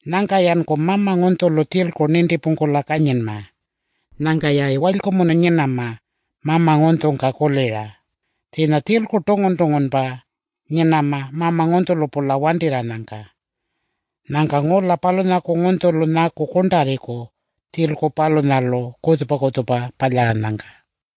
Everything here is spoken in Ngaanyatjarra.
Nyangka-yanku mama ngunytjulu tjilku nintipungkula kanyinma. Nyangka-yayi walykumunu nyinama, mama ngunytjungka kulira. Tjiinya tjilku tungun-tungunpa nyinama mama ngunytjulu-pula wantirranyangka. Nyangka ngula palunyaku ngunytjulu nyaku kurntarriku tjilku palunyalu kutjupa-kutjupa palyaranyangka. Yuwa, palunya.